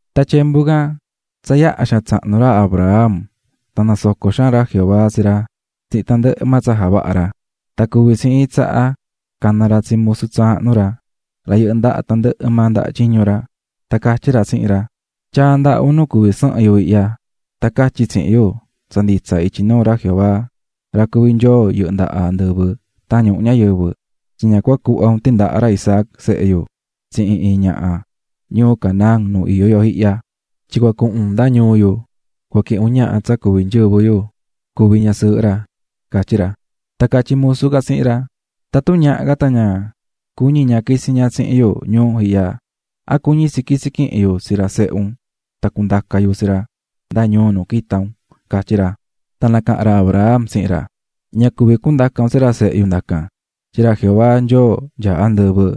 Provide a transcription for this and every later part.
Tan tyembu can tsa yaha xaan tsahnu ra Abraham tan nasoco̱ xaan ra Jehová tsi ra tsihin tandɨhɨ maa tsa javaha̱ ra. Tan cuvi̱ tsi iin tsaha cana̱ ra tsi musu tsaahnu ra, ra yɨhɨ́ ndaha tandɨhɨ maa ndaha tyiñu ra, tan catyí ra tsihin ra: --Tya̱a ndaha un nu cuví sɨhɨn yu ihya. Tan ca̱tyi tsihin yu tsa nditsa ityi nuu ra Jehová, ra cuví Nyoo yɨhɨ́ ndaha andɨvɨ tan ñuhu ñayɨvɨ, tyin ña cua cuhva un tindaha ra Isaac, sehe yu, tsihin iin ñaha ñuu Canaán nu iyó yo ihya. Tyin cua cuhun un nda ñuu yu cuquihin un ñaha tsa cuví nyɨvɨ yu cuvi ñasɨɨhɨ ra --catyí ra. Tan catyí musu can tsihin ra: --Tatun ñaha can tan ña cuñi ña quitsi ña tsihin yu ñuu ihya, ¿a cuñi tsi quitsi quihin yu tsi ra sehe un tan cundaca yu tsi ra nda ñuu nu quita̱ un? ―catyí ra. Tan nacaha̱n ra Abraham tsihin ra: --¡Ña cuví quihin un tsi ra sehe yu cuhun tsihin un ndacan! Tyin ra Jehová Nyoo nyaá andɨvɨ,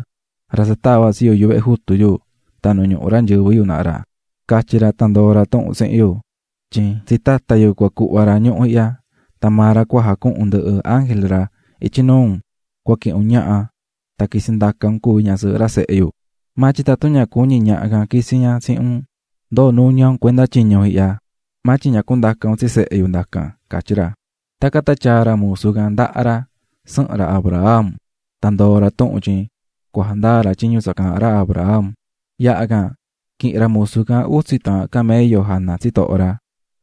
ra tsa tava̱ tsi yu yuvehe jutu yu tan nu ñuhu ra nyɨvɨ yu naha ra, catyi̱ ra tan ndoo̱ ra tuhun tsihin yu, tyin tsi tata yu cua cuhva ra ñuhu ihya. Tan maa ra cua jacuhun ndɨhɨ ángel ra ityi nuu un nu cua cuquihin un ñaha tan quitsi tsihin un cuvi ñasɨɨhɨ ra sehe yu. Maa tyin tatun ña cuñi ñaha can quitsi ña tsihin un, ndoo nuña un cuenda tyiñu ihya, maa tyin ña cundaca un tsi sehe yu ndacan --catyí ra. Tacan tan tyaa̱ ra musu can ndaha ra sɨhɨn ra Abraham, tan ndoo̱ ra tuhun tyin cua jandaa ra tyiñu tsa caahán ra Abraham. Yaha can, quihi̱n ra musu can utsi taahan camello jana tsitoho ra,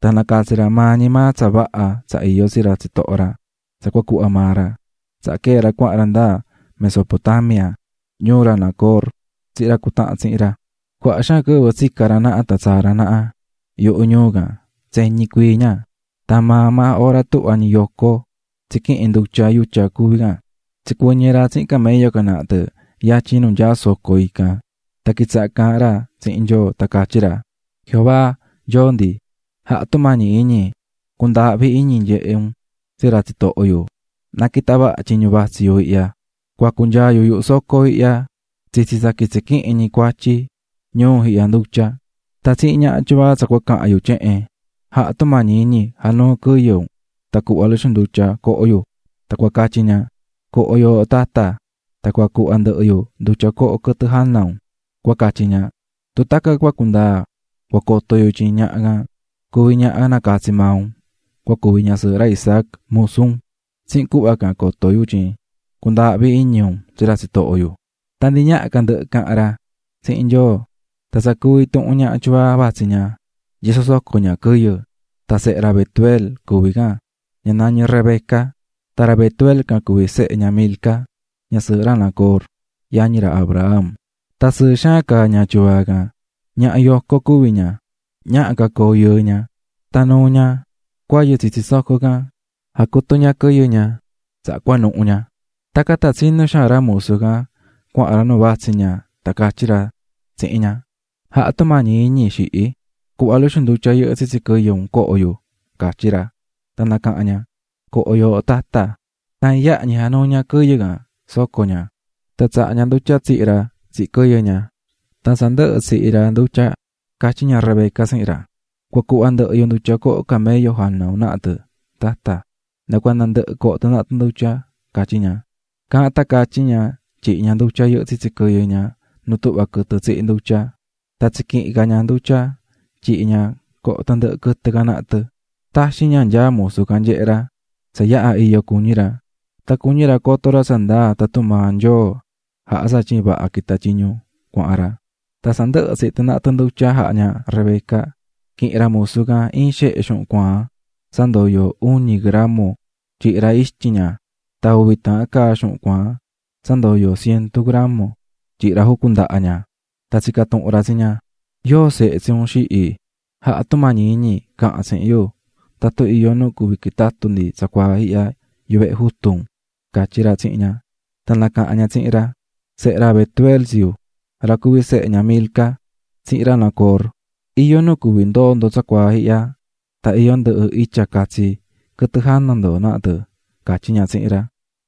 tan nacatsi̱ ra maa ñi maa tsa vaha tsa iyó tsi ra tsitoho ra tsa cua cuhva maa ra. Tsaha quee̱ ra cuahan ra nda Mesopotamia, ñuu ra Nacor, tsihin ra cutahán tsihin ra. Cuaha xaan quɨvɨ tsica̱ ra naha tan tsaa̱ ra naha yuhu ñuu can tseñi cuii ña, tan maa maa ora tuhva ñi yoco tsiquihín ndutya yutya cuví can, tsicuɨñɨ̱ ra tsihin camello can naha tɨ yatyin nu nyaá iin soco. Tan quitsaha̱ caahán ra tsihin Nyoo tan catyí ra: "Jehová Nyoo ndi, ja̱ha tumañi iñi cu̱ndaahvi iñi nyehe un tsi ra tsitoho yu, na quita vaha tyiñu vatsí yu ihya. Cua cunyaa yu yuhu soco ihya tsitsi tsa cua quitsi quihin ñi cuatyi ñuu ihya ndutya. Tan tsihin ñaha tyuvaa tsa cua cahan yu tyehen: 'Ja̱ha tumañi iñi ja̱nuu quɨyɨ un tan cu̱hva luxu ndutya coho yu', tan cua catyí ña: 'Coho yooho tata, tan cua cuhva ndɨhɨ yu ndutya coho quɨtɨ jana un', cua catyi ña. Tun tacan cua cundaa, cua coto yu tyin ñaha can cuví ñaha nacatsi̱ maa un cua cuvi ñasɨɨhɨ ra Isaac musu un. Tsihin cuhva can coto yu tyin cundaahví iñi un tsi ra tsitoho yu." Tan ndi ñaha ca ndɨhɨ cahan ra tsihin Nyoo, tan tsa cuú intuhun ñaha tyuvaa vatsí ña yosó soco ña quɨyɨ. Tan sehe ra Betuel cuví tsi ña, Rebeca nañí ña, tan ra Betuel can cuví sehe ña Milca, ñasɨɨhɨ ra Nacor, yañi ra Abraham. Tan sɨɨ xaan caá ña tyuvaa can, ñaha yoco cuví ña, ñaha ca coo yɨɨ ña. Tan nuu̱ ña cuayɨ tsitsi soco can, jacutu̱ ña quɨyɨ ña, tsaha cuanuhu̱ ña. Tacan tan tsinú xaan ra musu can cuahan ra nu cuahan ña tan catyí ra tsihin ña: --Ja̱ha tumañi iñi, xihi, cu̱hva luxu ndutya yɨhɨ́ tsitsi quɨyɨ un coho yu --catyí ra. Tan nacaha̱n ña: --Co̱ho yooho, tata. Tan iyaha ñi januu̱ ña quɨyɨ can soco ña, tan tsaha̱ ña ndutya tsihi̱ ra tsihin quɨyɨ ña. Tan tsa ndɨhɨ̱ tsihi̱ ra ndutya, catyí ña Rebeca tsihin ra: --Cua cuhva ndɨhɨ yu ndutya coho camello jana un naha tɨ, tata, nda cuanda ndɨhɨ coho tɨ naha tɨ ndutya --catyí ña. Caahán tan catyí ña tyihi̱ ña ndutya yɨhɨ́ tsitsi quɨyɨ ña nu tuhva quɨtɨ tsihí ndutya. Tan tsiquihi̱n ca ña ndutya tyihi̱ ña coho tandɨhɨ quɨtɨ can naha tɨ. Taxin ña nyaá musu can nyehé ra tsa yaha iyo cuñí ra, tan cuñí ra coto ra tsa ndaa tatun maa Nyoo jaha̱ tsatyin vaha quita̱ tyiñu cuahan ra. Tan tsa ndɨhɨ̱ tsihi̱ tɨ naha tɨ ndutya jaha̱ ña Rebeca, quihi̱n ra musu can iin xehe xuhun cuaan tsa ndoyó iñu gramo tyihi̱ ra ixtyin ña tan uvi taahan caa xuhun cuaan tsa ndoyó cientu gramo tyihi̱ ra jucun ndaha ña. Tan tsica̱ tuhun ra tsi ña: --¿Yóo sehe tsi un, xihi? Ja̱ha tumañi iñi ca̱han tsihin yu tatun iyó nu cuví quitatu ndi tsacuaa ihya yuvehe jutu un --catyí ra tsihin ña. Tan nacaha̱n ña tsihin ra: --Sehe ra Betuel tsi yu, ra cuví sehe ña Milca tsihin ra Nacor. Iyó nu cuví ndoo ndo tsacuaa ihya tan iyó ndɨhɨ itya catsi quɨtɨ jana ndo naha tɨ --catyí ña tsihin ra.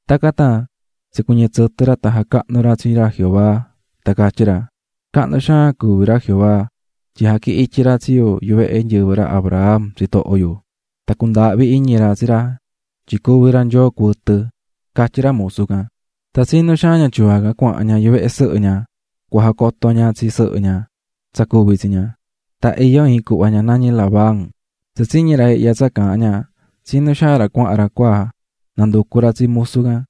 Tacan tan tsicuɨñɨ̱ tsɨtɨ ra tan jacahnu̱ ra tsi ra Jehová. Tan catyí ra: "Cahnu xaan cuví ra Jehová tyin jaquihi̱n ityi ra tsi yu yuvehe nyɨvɨ ra Abraham, tsitoho yu, tan cundaahvi̱ iñi ra tsi ra tyin cuví ra Nyoo cuɨtɨ", catyí ra musu can. Tan tsinú xaan ña tyuvaa can cuahan ña yuvehe sɨhɨ ña cua jacoto ña tsi sɨhɨ ña tsa cuvi̱ tsi ña. Tan iyó iin cuhva ña nañí Labán. Tsa tsiñi̱ ra ihya tsa caahán ña, tsinú xaan ra cuahan ra cua nanducu ra tsi musu can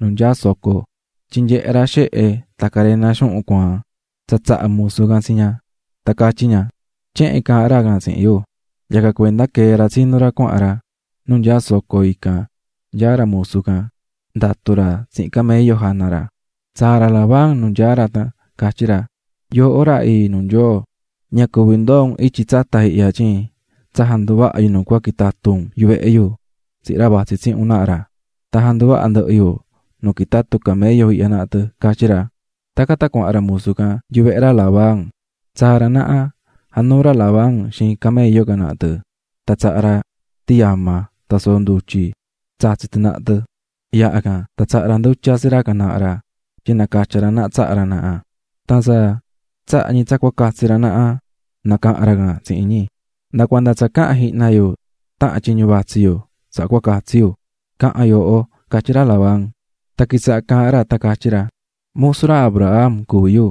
nu nyaá soco. Tyin nyehe̱ ra xehe tan carena xuhun cuaan tsa tsaha̱ musu can tsi ña. Tan catyí ña: "Tyehen caahán ra can tsihin yu", yacan cuenda quee̱ ra tsinú ra cuahan ra nu nyaá soco ican nyaá ra musu can ndatú ra tsihin camello jana ra. Tsaa̱ ra Labán nu nyaá ra tan catyí ra: --Yooho ra ii nuu Nyoo, ña cuví ndoo un ityi tsata ihya tyin tsa janduvaha̱ yu nu cua quitatu un yuvehe yu tsihin ra vatsí tsihin un naha ra tan janduvaha̱ ndɨhɨ yu nu quitatu camello ihya naha tɨ ―catyí ra. Tacan tan cuahan ra musu can yuvehe ra Labán. Tsaa̱ ra naha, januu̱ ra Labán xiin camello can naha tɨ tan tsaha̱ ra tiyama tan soo ndutyi tsatsí tɨ naha tɨ. Yaha can tan tsaha̱ ra ndutya tsi ra can naha ra tyin nacatya ra naha tsaha ra naha. Tan tsa tsaha̱ ñi tsa cua catsi ra naha, nacaha̱n ra can tsihin ñi: --Nda cuanda tsa cahan jihna yu tahan tyiñu vatsi yu, tsaha cua catsi yu. --Ca̱han yooho --catyí ra Labán. Tan quitsahá caahán ra tan catyí ra: --Musu ra Abraham cuví yu.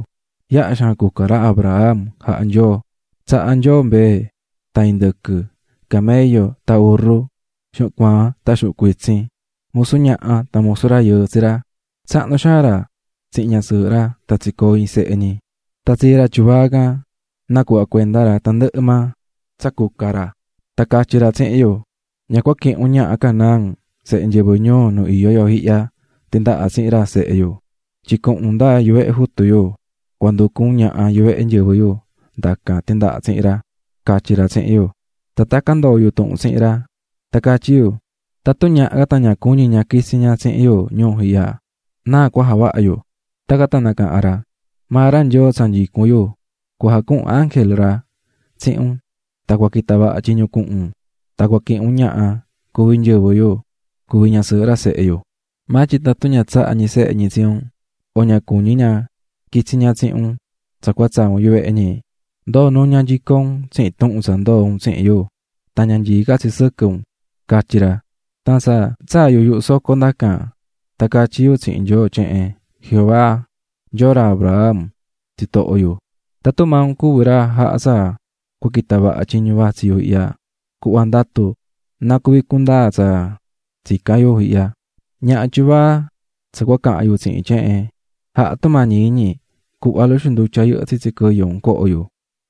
Yaha xaan cuca ra Abraham jaha̱ Nyoo: Tsaha̱ Nyoo mbee tan indɨquɨ, camello tan urru, xuhun cuaan tan xuhun cuitsin, musu ñaha tan musu rayɨɨ tsi ra. Tsahnu xaan ra tsihin ñasɨɨhɨ ra tan tsicoo̱ iin sehe ñi. Tan tsii ra tyuvaa can nacuhva̱ cuenda ra tandɨhɨ maa tsa cuca ra. Tan catyi̱ ra tsihin yu: ꞌÑa cua quihin un ñaha Canaán, sehe nyɨvɨ ñuu nu iyó yu ihya, tindaha tsihin ra sehe yu, tyin cuhun un nda yuvehe jutu yu, cua nducu un ñaha yuvehe nyɨvɨ yu ndacan tindaha tsihin raꞌ, catyi̱ ra tsihin yu. Tan tacan ndoo̱ yu tuhun tsihin ra. Tan catyí yu: ꞌTatun ñaha can tan ña cuñi ña quitsi ña tsihin yu ñuu ihya, ¿náa cua javaha yu?ꞌ Tacan tan nacaha̱n ra: ꞌMaa ra Nyoo tsa nyicún yu cua jacuhun ángel ra tsihin un, tan cua quita vaha tyiñu cuhun un, tan cua quihin un ñaha cuví nyɨvɨ yu cuvi ñasɨɨhɨ ra sehe yu. Maa tyin tatun ña tsahá ñi sehe ñi tsi un o ña cuñí ña quitsi ña tsihin un tsa cua tsaa un yuvehe ñi, ndoo nuña nyico un tsihin tuhun tsa ndoo̱ un tsihin yu, tan ña nyií ca tsi sɨquɨ unꞌ, catyi̱ ra. "Tan tsa tsaa̱ yu yuhu soco ndacan, tan catyí yu tsihin Nyoo tyehen: ꞌJehová, Nyoo ra Abraham tsitoho yu, tatun maa un cuví ra cua jaha tsa cua quita vaha tyiñu vatsí yu ihya, cu̱hva ndatu na cuvi cundaa tsa tsicán yu ihya, ñaha tyuvaa tsa cua cahan yu tsihin tyehen: Ja̱ha tumañi iñi cu̱hva luxu ndutya yɨhɨ́ tsitsi quɨyɨ un coho yu,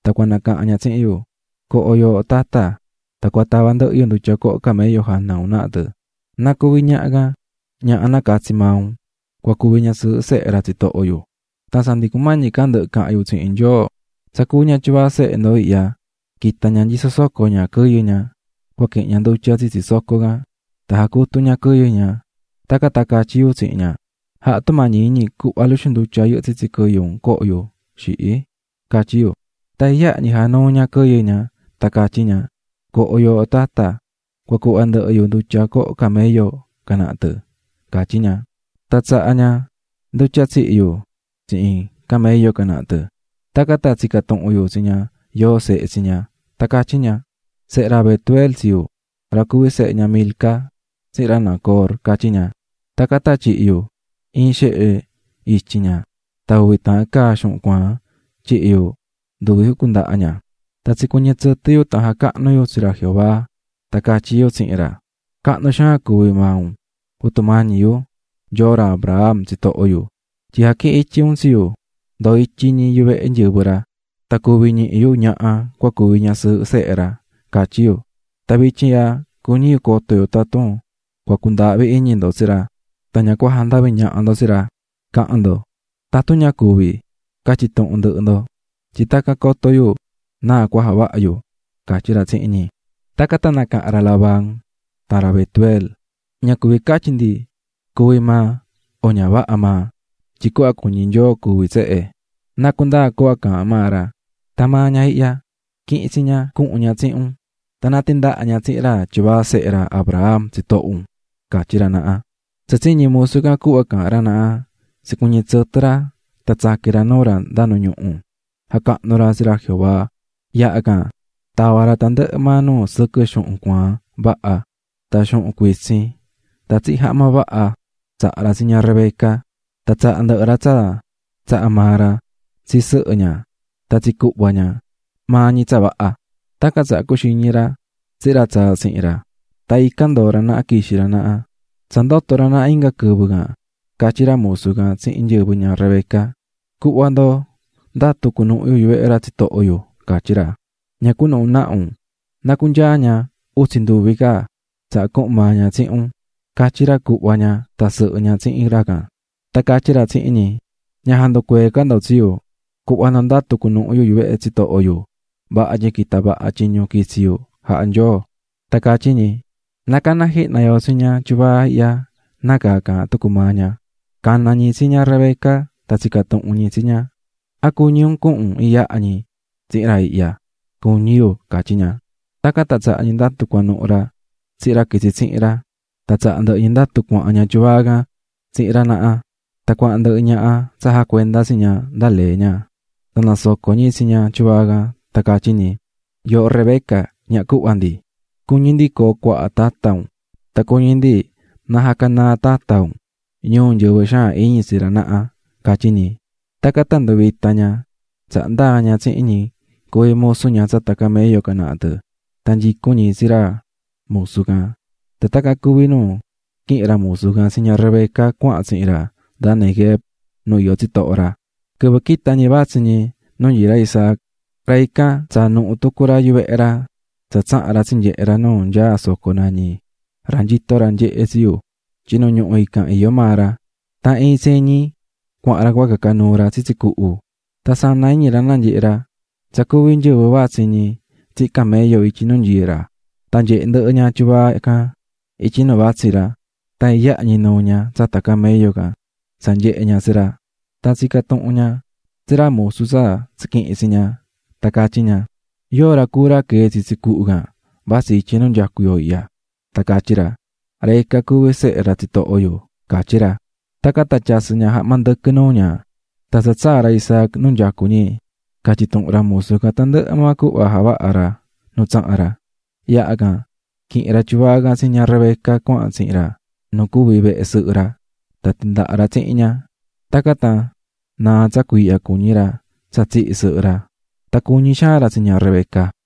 tan cua nacahan ña tsihin yu: Co̱ho, yooho tata, tan cua tava ndɨhɨ yu ndutya coho camello jana un naha tɨ. Na cuvi ñaha can, ñaha nacatsi̱ maa un cua cuvi ñasɨɨhɨ sehe ra tsitoho yu.ꞌ Tsa ndi cumañi ca ndɨhɨ cahan yu tsihin Nyoo, tsa cuú ña tyuvaa sehe ndo ihya quita̱ ña yosó soco ña quɨyɨ ña cua quihin ña ndutya tsitsi soco can, tan jacutu̱ ña quɨyɨ ña. Tacan tan catyí yu tsihin ña: 'Ja̱ha tumañi iñi cu̱hva luxu ndutya yɨhɨ́ tsitsi quɨyɨ un coho yu, xihiꞌ, catyí yu. Tan iyaha ñi januu̱ ña quɨyɨ ña tan catyí ña: 'Co̱ho yooho tata, tan cua cuhva ndɨhɨ yu ndutya coho camello can naha tɨ', catyí ña. Tan tsaha̱ ña ndutya tsihi̱ yu tsihin camello can naha tɨ. Tacan tan tsica̱ tuhun yu tsi ña yóo sehe tsi ña, tan catyí ña: 'Sehe ra Betuel tsi yu, ra cuví sehe ña Milca tsihin ra Nacor', catyí ña. Tacan tan tyihi̱ yu iin xehe ixtyin ña tan uvi taahan caa xuhun cuaan tyihi̱ yu nduvi jucun ndaha ña. Tan tsicuɨñɨ̱ tsɨtɨ yu tan jacahnu̱ yu tsi ra Jehová tan catyí yu tsihin ra: ꞌCahnu xaan cuví maa un, Jehová, Nyoo ra Abraham tsitoho yu, tyin jaquihi̱n ityi un tsi yu ndoo ityi ñi yuvehe nyɨvɨ ra, tan cuvi̱ ñihi yu ñaha cua cuvi ñasɨɨhɨ sehe raꞌ, catyí yu. Tan vityin ihya cuñí yu coto yu tatun cua cundaahvi iñi ndo tsi ra, tan ña cua jandavi ñaha ndo tsi ra, ¡ca̱han ndo! Tatun ña cuvi, ¡ca̱tyi tuhun ndɨhɨ ndo! tyin tacan coto yu náa cua javaha yu --catyí ra tsihin ñi. Tacan tan nacaha̱n ra Labán tan ra Betuel: --Ña cuvi catyi ndi cuví maa o ña vaha maa, tyin cuhva cuñí Nyoo cuví tsehe. Na cundaa cuhva caahán maa ra. Tan maa ña ihya, qui̱hin tsi ña cuhun ña tsihin un, tan na tindaha ña tsihin ra tyuvaa sehe ra Abraham, tsitoho un --catyí ra naha. Tsa tsiñi̱ musu can cuhva caahán ra naha, tsicuɨñɨ̱ tsɨtɨ ra tan tsaqui̱n ra nuu ra nda nu ñuhu jacahnu̱ ra tsi ra Jehová. Yaha can, tava̱ ra tandɨhɨ maa nuu sɨquɨ xuhun cuaan vaha tan xuhun cuitsin tan tsihin jahma vaha tsaha̱ ra tsi ña Rebeca, tan tsaha̱ ndɨhɨ ra tsa tsaha̱ maa ra tsi sɨhɨ ña tan tsi cuhva ña, maa ñi tsa vaha. Tacan, tsaha cuxiñi̱ ra tsihin ra tsaa̱ tsihin ra, tan ican ndoo̱ ra naha quixi̱ ra naha. Tsa ndoto̱ ra naha inga quɨvɨ can, catyí ra musu can tsihin nyɨvɨ ña Rebeca: --Cu̱hva ndo ndatu cunuhu yu yuvehe ra tsitoho yu --catyí ra. --Ña cu̱nuhu naha un, na cunyaa ña utsi nduvi ca, tsaha cuhun maa ña tsihin un --catyí ra cuhva ña tan sɨhɨ ña tsihin ra can: Tan catyí ra tsihin ñi: --Ña ja̱nducuee ca ndo tsi yu. Cu̱hva ndo ndatu cunuhu yu yuvehe tsitoho yu, vaha tyin quita̱ vaha tyiñu quitsi̱ yu jaha̱ Nyoo. Tan catyí ñi: --Na cana jihna yo tsi ña tyuvaa ihya nácaa caahán tucu maa ña. Cana̱ ñi tsi ña Rebeca tan tsica̱ tuhun ñi tsi ña: --¿A cuñí un cuhun un iyaha ñi tsihin ra ihya? --Cuñí yu --catyí ña. Tacan tan tsaha̱ ñi ndatu cuanuhu ra tsihin ra quitsi̱ tsihin ra, tan tsaha̱ ndɨhɨ ñi ndatu cuahan ña tyuvaa can tsihin ra naha. Tan cuahan ndɨhɨ ñaha tsa jacuendá tsi ña nda lee ña. Tan nasoco̱ ñi tsi ña tyuvaa can, tan catyí ñi: "Yooho Rebeca, ñaha cuhva ndi, cuñí ndi coo cuaha tata un tan cuñí ndi na jacanaa tata un ñuu nyɨvɨ xaan iñi tsi ra naha", catyí ñi. Tacan tan nduvita̱ ña, tsaha ndaa̱ ña tsihin ñi cuví musu ña tsata camello can naha tɨ. Tan nyicún ñi tsi ra musu can. Tan tacan cuví nu quihi̱n ra musu can tsi ña Rebeca cuahan tsihin ra nda Neguev nu iyó tsitoho ra. Quɨvɨ quita̱ ñi vatsí ñi nu nyií ra Isaac, ra ican tsaa̱ nuhu tucu ra yuvehe ra tsa tsaha̱n ra tsinyehe̱ ra nu nyaá soco nañí: "Ra nyito ra nyehé tsi yu" tyin nu ñuhu ican iyó maa ra. Tan iin tseñi cuahan ra cua caca nuu ra tsitsi cuhu. Tan sana iñi ra nanyehe̱ ra tsa cuví nyɨvɨ vatsí ñi tsihin camello ityi nu nyií ra. Tan nyehe̱ ndɨhɨ ña tyuvaa can ityi nu vatsí ra, tan iyaha ñi nuu̱ ña tsata camello can tsa nyehe̱ ña tsi ra. Tan tsica̱n tuhun ña tsi ra musu tsa tsiquihi̱n tsi ña tan catyí ña: --¿Yóo ra cuú ra quee̱ tsitsi cuhu can vatsí ityi nu nyacú yo ihya? Tan catyí ra: --Ra ican cuví sehe ra tsitoho yu --catyí ra. Tacan tan tyasɨ̱ ña jahma ndɨquɨ nuu ña. Tan tsa tsaa̱ ra Isaac nu nyacú ñi, catyi̱ tuhun ra musu can tandɨhɨ maa cuhva javaha̱ ra nu tsaha̱n ra. Yaha can, quihi̱n ra tyuvaa can tsi ña Rebeca cuahan tsihin ra nu cuvi̱ vehe sɨhɨ ra, tan tindaha̱ ra tsihin ña. Tacan tan naa̱ tsa cuiihya cuñí ra tsa tsihi̱ sɨhɨ ra, tan cuñí xaan ra tsi ña Rebeca.